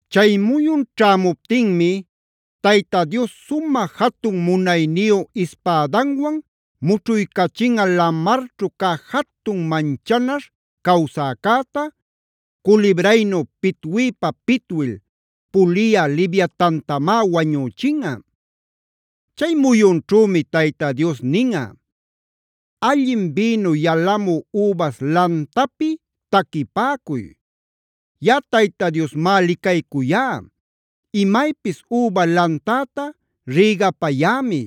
Chay muyun ćhämuptinmi Tayta Dios sumä jatun munayniyu ispädanwan mućhuycachinꞌa lamarćhu cä jatun manchanaśh cawsäcäta,a culibraynu pitwiypa-pitwil puliyä Leviatantamá wañüchinꞌa. Chay muyunćhümi Tayta Dios ninꞌa: “Allin bïnu yalamü übas lantapi taquipäcuy. Yaꞌa Tayta Diosmá licaycuyá, imaypis üba lantäta rïgapayämi.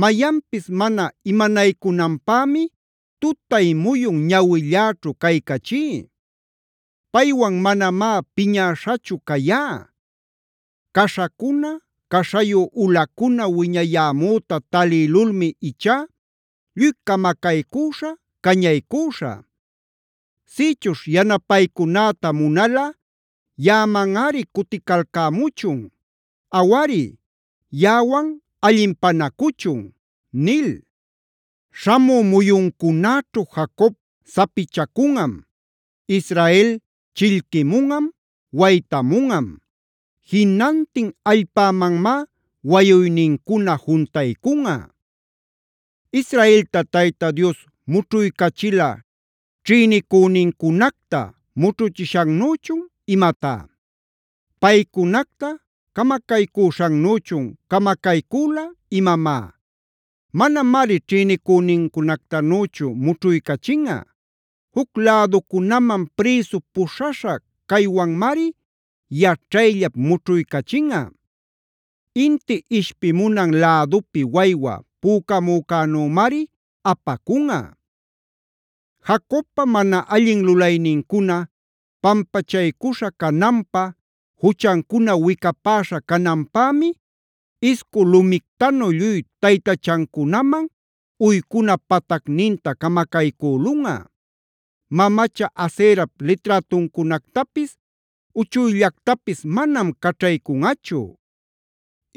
Mayanpis mana imanaycunanpämi tutay-muyun ñawilläćhu caycachí. Paywan manamá piñäśhachu cayá. Caśhacuna, caśhayu ulacuna wiñayämüta talïlulmi ichá lluy camacaycüśhä, cañaycüśhä. Sïchuśh yanapaycunäta munalꞌa yaꞌamanꞌari cuticalcämuchun. Awari, yaꞌawan allinpanacuchun” nil. Śhamü muyuncunäćhu Jacob sapichacunꞌam; Israel chillquimunꞌam, waytamunꞌam. Jinantin allpämanmá wayuynincuna juntaycunꞌa. ¿Israelta Tayta Dios mućhuycachila ćhïnicünincunacta mućhuchishannüchun imatá? ¿Paycunacta camacaycuśhannüchun camacaycüla imamá? Manamari ćhïnicünincunactanüchu mućhuycachinꞌa; juc läducunaman prïsu puśhaśha caywanmari yaćhayllap mućhuycachinꞌa; inti ishpimunan lädupi waywa pücamücänümari apacunꞌa. Jacobpa mana allin lulaynincuna pampachaycuśha cananpä, juchancuna wicapäśha cananpämi iscu lumictanu lluy taytachancunaman uycuna patacninta camacaycülunꞌa; mamacha Aserap liträtuncunactapis uchuyllactapis manam caćhaycunꞌachu;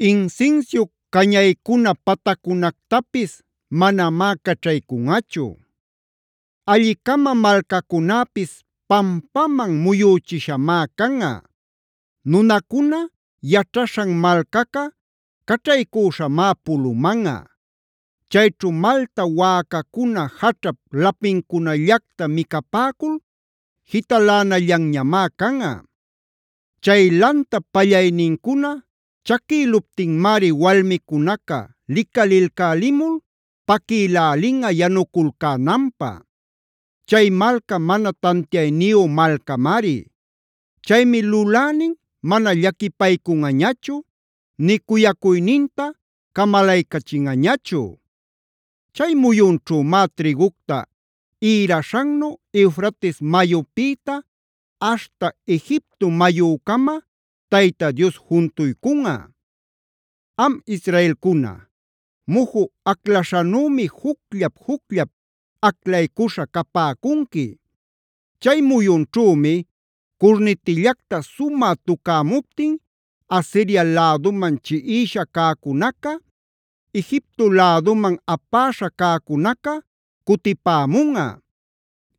insinsiu cañaycuna pataccunactapis manamá caćhaycunꞌachu. Alli-cama malcacunäpis pampaman muyüchishamá canꞌa. Nunacuna yaćhaśhan malcaca caćhaycüśhamá pulumanꞌa; chayćhu malta wäcacuna jaćhap lapincunallacta micapäcul jitalänallanñamá canꞌa. Chay lantap pallaynincuna chaquïluptinmari walmicunaca licalilcälimul paquïlälinꞌa yanuculcänanpä. Chay malca mana tantiayniyu malcamari. Chaymi lulänin mana llaquipaycunꞌañachu, nï cuyacuyninta camalaycachinꞌañachu. Chay muyunćhümá trïgucta ïraśhannu Eufrates mayupïta aśhta Egipto mayücama Tayta Dios juntuycunꞌa. Am israelcuna, muju aclaśhanümi jucllap-jucllap aclaycuśha capäcunqui. Chay muyunćhümi curnitillacta sumä tucämuptinb Asiria läduman chiꞌisha cäcunaca, Egipto läduman apäśha cäcunaca cutipämunꞌa.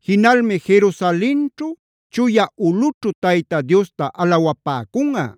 Jinalmi Jerusalenćhu, chuya ulꞌućhu Tayta Diosta alawapäcunꞌa.